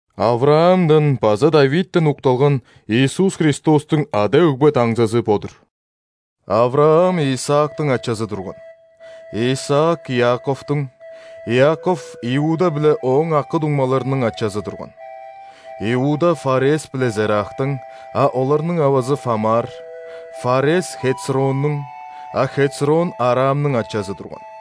·Авраамдан база ·Давидтен укталган Иисус Христостуң ада-өгбе даңзызы бо-дур. Авраам Исаактың ачазы турган. Исаак – Иаковтуң, Иаков – Иуда биле ооң акы-дуңмаларының ачазы турган. Иуда – Фарес биле Зерахтың (а оларның авазы – Фамар), Фарес – Хецроннүң, а Хецрон Арамның ачазы турган.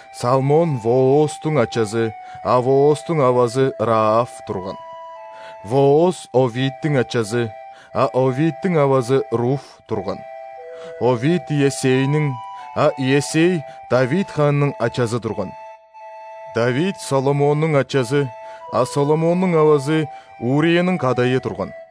Салмон – Воозтуң ачазы (а Воозтуң авазы – Раав) турган. Вооз – Овидтиң ачазы (а Овидтиң авазы – Руф) турган. Овид – Иессейниң, а Иессей Давид хаанның ачазы турган. Давид – ·Соломоннуң ачазы (а Соломоннуң авазы – Урияның кадайы) турган.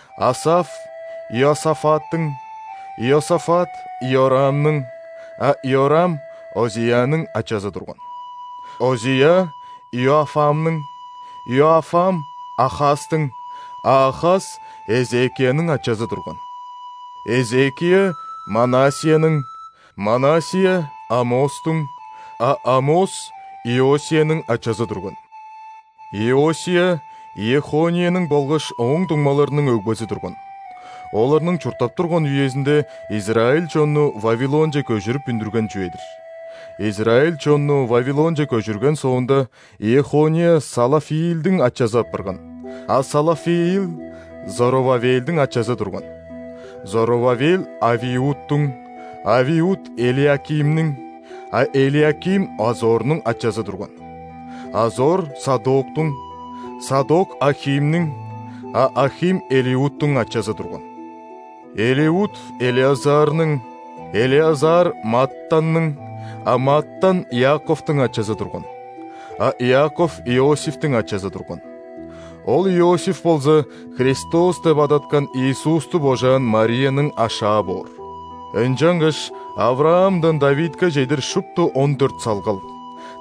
Асаф – Иосафаттың, Иосафат – Иорамның, а Иорам Озияның ачазы турган. Озия – Иоафамның, Иоафам – Ахазтың, а Ахаз Эзекияның ачазы турган. Эзекия – Манассияның, Манассия – Амостуң, а Амос Иосияның ачазы турган. Иосия – Иехонияның болгаш ооң дуңмаларының өгбези турган. (Оларның чурттап турган үезинде израиль чонну Вавилонче көжүрүп үндүрген чүве-дир.) Израиль чонну Вавилонче көжүрген соонда, Иехония Салафиилдиң ачазы апарган, а Салафиил Зоровавелдиң ачазы турган. Зоровавел – Авиудтуң, Авиуд – Элиакимниң, а Элиаким Азорнуң ачазы турган. Азор – Садоктуң, Садок – Ахимниң, а Ахим Элиудтуң ачазы турган. Элиуд – Элеазарның, Элеазар – Маттанның, а Маттан Иаковтуң ачазы турган. А Иаков Иосифтиң ачазы турган. Ол Иосиф болза Христос деп адаткан Иисусту божаан Марияның ашаа боор. Ынчангаш Авраамдан Давидке чедир шупту он дөрт салгал,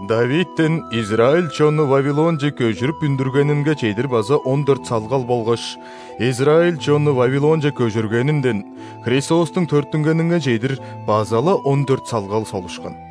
Давидтен израиль чонну Вавилонче көжүрүп үндүргенинге чедир база он дөрт салгал болгаш израиль чонну Вавилонче көжүргенинден Христостуң төрүттүнгенинге чедир база-ла он дөрт салгал солушкан.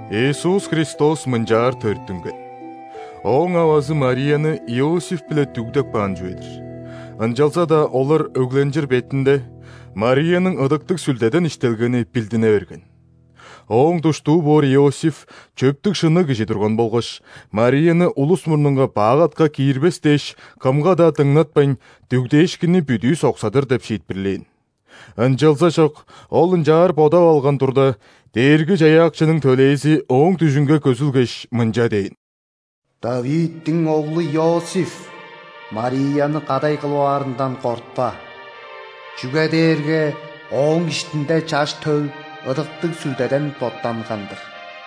Иисус Христос мынчаар төрүттүнген. Ооң авазы Марияны Иосиф-биле дүгдеп каан чүве-дир. Ынчалза-даа олар өгленчир бетинде, Марияның Ыдыктыг Сүлдеден иштелгени билдине берген. Ооң душтуу боор Иосиф чөптүг-шынныг кижи турган болгаш, Марияны улус мурнунга бак атка киирбес дээш, кымга-даа дыңнатпайн, дүгдээшкинни бүдүү соксадыр деп шиитпирлээн. Ынчалзажок ол ынчаар бодап алган турда, Дээрги-Чаяакчының төлээзи ооң дүжүнге көзүлгеш, мынча дээн: «·Давидтиң оглу, Иосиф, Марияны кадай кылып аарындан кортпа. Чүге дээрге ооң иштинде Чаш төл Ыдыктыг Сүлдеден боттанган-дыр.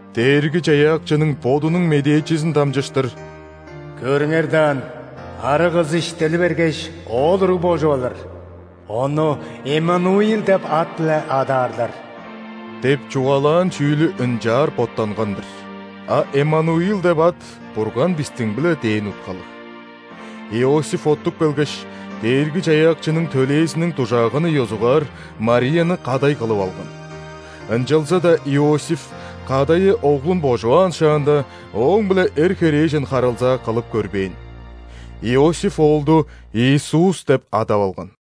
(Дээрги-Чаяакчының Бодунуң медээчизин дамчыштыр: «Көрүңер даан, арыг кыс иштели бергеш, оол уруг божуп алыр, Ону Эммануил деп ат-биле адаарлар» – деп чугаалаан чүүлү ынчаар боттанган-дыр. А Эммануил деп ат «Бурган бистиң-биле» дээн уткалыг.) Иосиф оттуп келгеш, Дээрги-Чаяакчының төлээзиниң дужааганын ёзугаар, Марияны кадай кылып алган. Ынчалза-даа Иосиф, кадайы оглун божуваан шаанда, ооң-биле эр, херээжен харылзаа кылып көрбээн. Иосиф оолду Иисус деп адап алган.